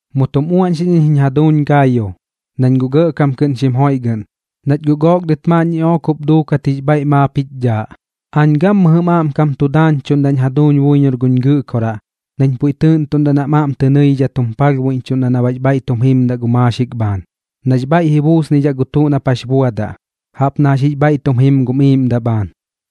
Mu tum uaꞌñxiꞌñ iñ jiñ jaduuñ Gaayo, nañ guꞌ gɇꞌkam kɨꞌn xim joiꞌgɨꞌn, nach guꞌ gook dɨt maaꞌn ñiꞌook jup duukat jix bhaiꞌ maap jich dhaaꞌ. Aañ gammɨjɨm aꞌmkam tu daañchuꞌndaꞌñ jaduuñ buiñor guch Gɨꞌkoraꞌ nañ puiꞌ tɨɨꞌntuꞌndaꞌ nam aꞌm tɨ nɨidhidhat jum palhbuiꞌñchuꞌndaꞌ na baꞌx bhaiꞌ tum jimdaꞌ gu maaxik bhaan, nax bhaiꞌ ji buusnidhaꞌ gu tuꞌ nap jax buadaꞌ, jaꞌp na jax jix bhaiꞌ tum jim gum iiꞌmdaꞌ bhaan.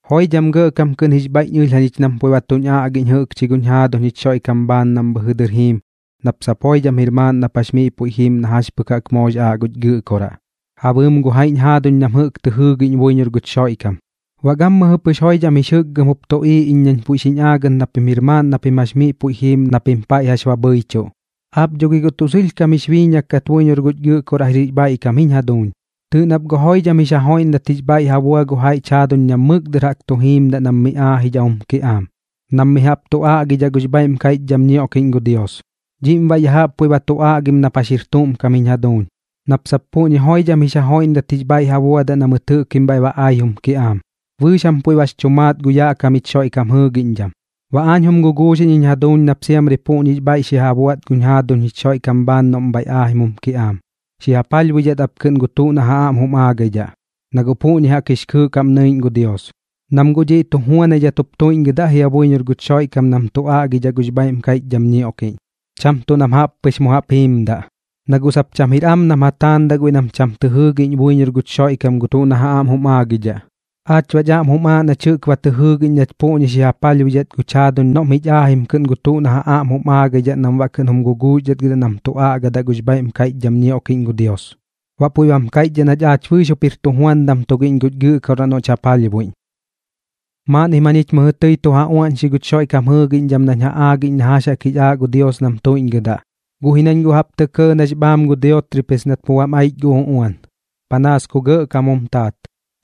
Joidham gɇꞌkam kɨꞌn jix bhaiꞌñ ɨlh jañich nam puiꞌ ba tuñ aꞌgiꞌñ jɨꞌkchi guñ jaaduñ jich Xoiꞌkam bhaan nam bhɨjɨ dɨr jiim, nap sap joidham jir maaꞌn nap jax miꞌ puiꞌ jim na jax pɨk jaꞌk moox aaꞌ guch Gɨꞌkoraꞌ ja bɨɨm gu jaiꞌñ jaaduñ nam jɨꞌk tɨ jɨɨgiꞌñ buiñor guch Xoiꞌkam. Baꞌ gammɨjɨ pɨx joidham jix jɨkgɨm jup tuꞌiiꞌ iñ nañ puiꞌ xiñ aagɨt na pim jir maaꞌn na pim jax miꞌ puiꞌ xi jiim na pim paiꞌ jax ba bhɨichuꞌ. Aap dho gi tuꞌ sɨlhkam jix biiñak kat buiñor guch Gɨꞌkoraꞌ jir jix bhaiꞌkam ji jiñ jaduuñ. Tɨɨꞌ nap guꞌ joidham jix ja joiꞌndat jix bhaiꞌ ja bua gu jaiꞌch jaaduñ nam mɨk dɨr jaꞌk tu jimdaꞌ nam miꞌ aajidhaꞌ jum kiꞌaam, nam mi jaꞌp tu aꞌgidhaꞌ gux bhaiꞌm kaiꞌchdham ñioꞌkiꞌñ gu Dios. Dhiꞌm baꞌ ya jaꞌp puiꞌ ba tu aꞌgim nap jax jir tuꞌm kam jiñ jaduuñ, nap sap puꞌñi joidham jix ja joiꞌndat jix bhaiꞌ ja buadaꞌ na mɨt jɨꞌkim bhaiꞌ ba ai jum kiꞌaam. Bɨɨx jam puiꞌ bax chu maat gu yaꞌ kam jich Xoiꞌkam jɨɨgiꞌñdham. Baꞌ aañ jum guguuxiꞌñ jiñ jaduuñ nap siamri puꞌñix bhaiꞌ xi ja buaꞌt guñ jaaduñ jich Xoiꞌkam bhaan noꞌm bhaiꞌ aajim jum kiꞌaam, xi ja palhbuidhat ap kɨꞌn gu tuꞌ na ja aꞌm jum aagaidhaꞌ, na guꞌ puꞌñi jaꞌk jix kɨɨꞌ kaꞌm nɨiꞌñ gu Dios. Nam guꞌ dhiꞌ tu juanaidhat jup tuiꞌñgɨdaꞌ jia buiñor guch Xoiꞌkam nam tu aꞌgidhaꞌ gux bhaiꞌm kaiꞌchdham ñioꞌkiꞌñ, cham tuꞌ nam jaꞌp pɨx mu jaꞌp jiimdaꞌ, na guꞌ sap cham jir am nam ja taandaꞌ guiꞌ nam cham tɨ jɨɨgiꞌñ buiñor guch Xoiꞌkam gu tuꞌ na ja aꞌm jum aagaidhaꞌ. Aach baꞌch aꞌm jum aaꞌ nach jɨꞌk ba tɨ jɨɨgiꞌñ nach puꞌñi xi ja palhbuidhat guch jaaduñ noꞌm jich aajim kɨꞌn gu tuꞌ na ja aꞌm jum aagaidhaꞌ nam baꞌ kɨꞌn jum guguuxdhatgɨdaꞌ nam tu aꞌgidhaꞌ gux bhaiꞌm kaiꞌchdham ñioꞌkiꞌñ gu Dios. Baꞌ puiꞌ bam kaiꞌchdhaꞌ nach aach bɨɨx jup jir tujuandam tugiꞌñ guch Gɨꞌkoraꞌ noꞌch ja palhbuiꞌñ. Maaꞌnnim jañich mɨjɨ tɨi tu ja uaꞌñxi guch Xoiꞌkam jɨɨgiꞌñdham nañ ja aagiꞌñ na jax jaꞌk jix aaꞌ gu Dios nam tuiꞌñgɨdaꞌ. Guꞌ ji nañ guꞌ jaꞌp tɇ kɇɇ nax bhaam gu Diotrepes nat mu bam aich gu uꞌuan, panaas ku gɇꞌkam jum taat.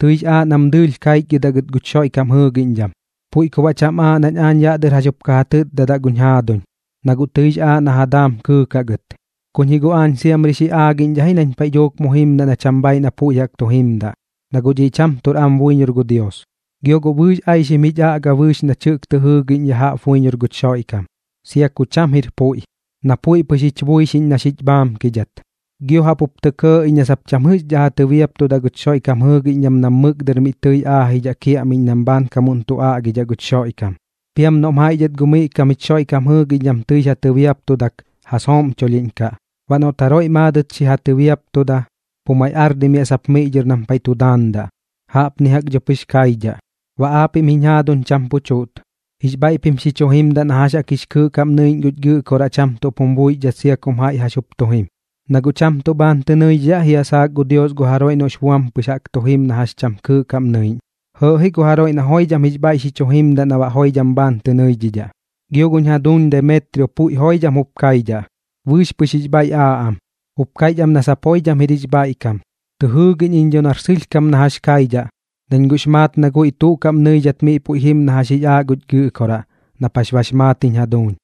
Tɨix aaꞌ nam dɨɨlh kaichgɨdaꞌ gɨt guch Xoiꞌkam jɨɨgiꞌñdham, puiꞌ ku baꞌ cham aaꞌ nañ aañ yaꞌ dɨr jax jup ka ja tɨtdadaꞌ guñ jaaduñ, na guꞌ tɨix aaꞌ na ja daam kɨɨkaꞌ gɨt. Kuñ ji guꞌ aañ siamri xi aagiꞌñdhaꞌ ji nañ paiꞌ dhuuk mu jimdaꞌ na cham bhaiꞌ na puiꞌ jaꞌk tu jimdaꞌ, na guꞌ dhiꞌ cham tuꞌr am buiñor gu Dios. Gio guꞌ bɨɨx aixim jich aꞌga bɨɨx nach jɨꞌk tɨ jɨɨgiꞌñ ya jaꞌp buiñor guch Xoiꞌkam, sia ku cham jir puiꞌ, na puiꞌ pɨx jich buixiꞌñ na xich bhaamkidhat. Gio jaꞌp jup tɇ kɇɇ iñ na sap cham jɨꞌxdhaꞌ ja tɨbiaptudaꞌ guch Xoiꞌkam jɨɨgiꞌñdham nam mɨk dɨr miꞌ tɨi aajidhaꞌ kiaꞌmiꞌñ nam bhaankamuꞌn tu aꞌgidhaꞌ guch Xoiꞌkam. Piam noꞌm jaiꞌ dhɨt gu miꞌ kam jich Xoiꞌkam jɨɨgiꞌñdham tɨix ja tɨbiaptudak, ja sooꞌmchulhiꞌñkaꞌ. Baꞌ noꞌt jaroiꞌ maadɨt xi ja tɨbiaptuda, pu maiꞌ ardimiaꞌ sap miꞌ dhɨr nam paiꞌ tu daandaꞌ. Jaꞌpni jaꞌk dho pɨx kaidhaꞌ. Baꞌ aap jiñ jaduuñ cham pu chuꞌt. Jix bhaiꞌp xi chu jimdaꞌ na jax jaꞌk jix kɨɨꞌ kaꞌm nɨiꞌñ guch Gɨꞌkoraꞌ cham tuꞌp jum buixdhat sia kum jaiꞌ jax jup tu jim. Na guꞌ cham tuꞌ bhaan tɨ nɨidhidhaꞌ jia saak gu Dios gu jaroiꞌ noꞌx buam pɨx tu jim na jax cham kɨɨꞌ kaꞌm nɨiꞌñ, jɇɇꞌ ji gu jaroiꞌ na joidham jix bhaiꞌ xi chu jimdaꞌ na baꞌ joidham bhaan tɨ nɨidhidhaꞌ. Gio guñ jaduuñ Demetrio puiꞌ joidham jup kaidhaꞌ, bɨɨx pɨx jix bhaiꞌ aaꞌ am, jup kaiꞌch am na sap joidham jir jix bhaiꞌkam. Tɨ jɨɨgiꞌñ iñ dho nar sɨlhkam na jax kaidhaꞌ, nañ guꞌx maat na guiꞌ tuꞌ kaꞌm nɨidhat miꞌ puiꞌ jim na jax jix aaꞌ guch Gɨꞌkoraꞌ, nap jax bax maat jiñ jaduuñ.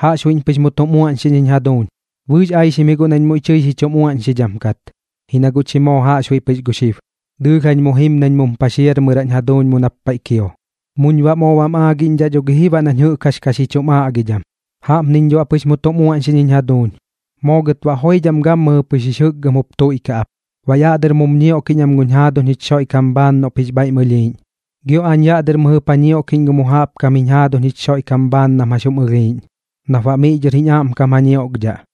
Jaꞌxbuiꞌñ pɨx mu tum uaꞌñxiꞌñ jiñ jaduuñ. Bɨɨx aixim ji guꞌ nañ muiꞌ tɨi xi chum uaꞌñxidham kat, ji na guꞌ chi moo jaꞌxbuiꞌ pɨx gu xib. Dɨɨlh jañ mu jim nañ mum paxiarmɨraꞌñ jaduuñ mu nap paiꞌ kio, muñ baꞌ moo bam aagiꞌñdhaꞌ dho gi ji baꞌ nañ jɨꞌk jax ka xi chum aꞌgidham. Jaꞌpniñ dho baꞌ pɨx mu tum uaꞌñxiꞌñ jiñ jaduuñ. Moo gɨt baꞌ joidham gammɨjɨ pɨx jix jɨkgɨm jup tuiꞌkaꞌ ap. Baꞌ yaꞌ dɨr mum ñioꞌkiꞌñ am gum jaaduñ jich Xoiꞌkam bhaan noꞌp jix bhaiꞌm ɨlhiiꞌñ, gio aañ yaꞌ dɨr mɨjɨp ja ñioꞌkiꞌñ gu mu jaꞌp kam jiñ jaaduñ jich Xoiꞌkam bhaan nam jax jum ɨlhiiꞌñ, nap baꞌ miꞌ dhɨr jiñ aꞌmkam ja ñioꞌkdhaꞌ.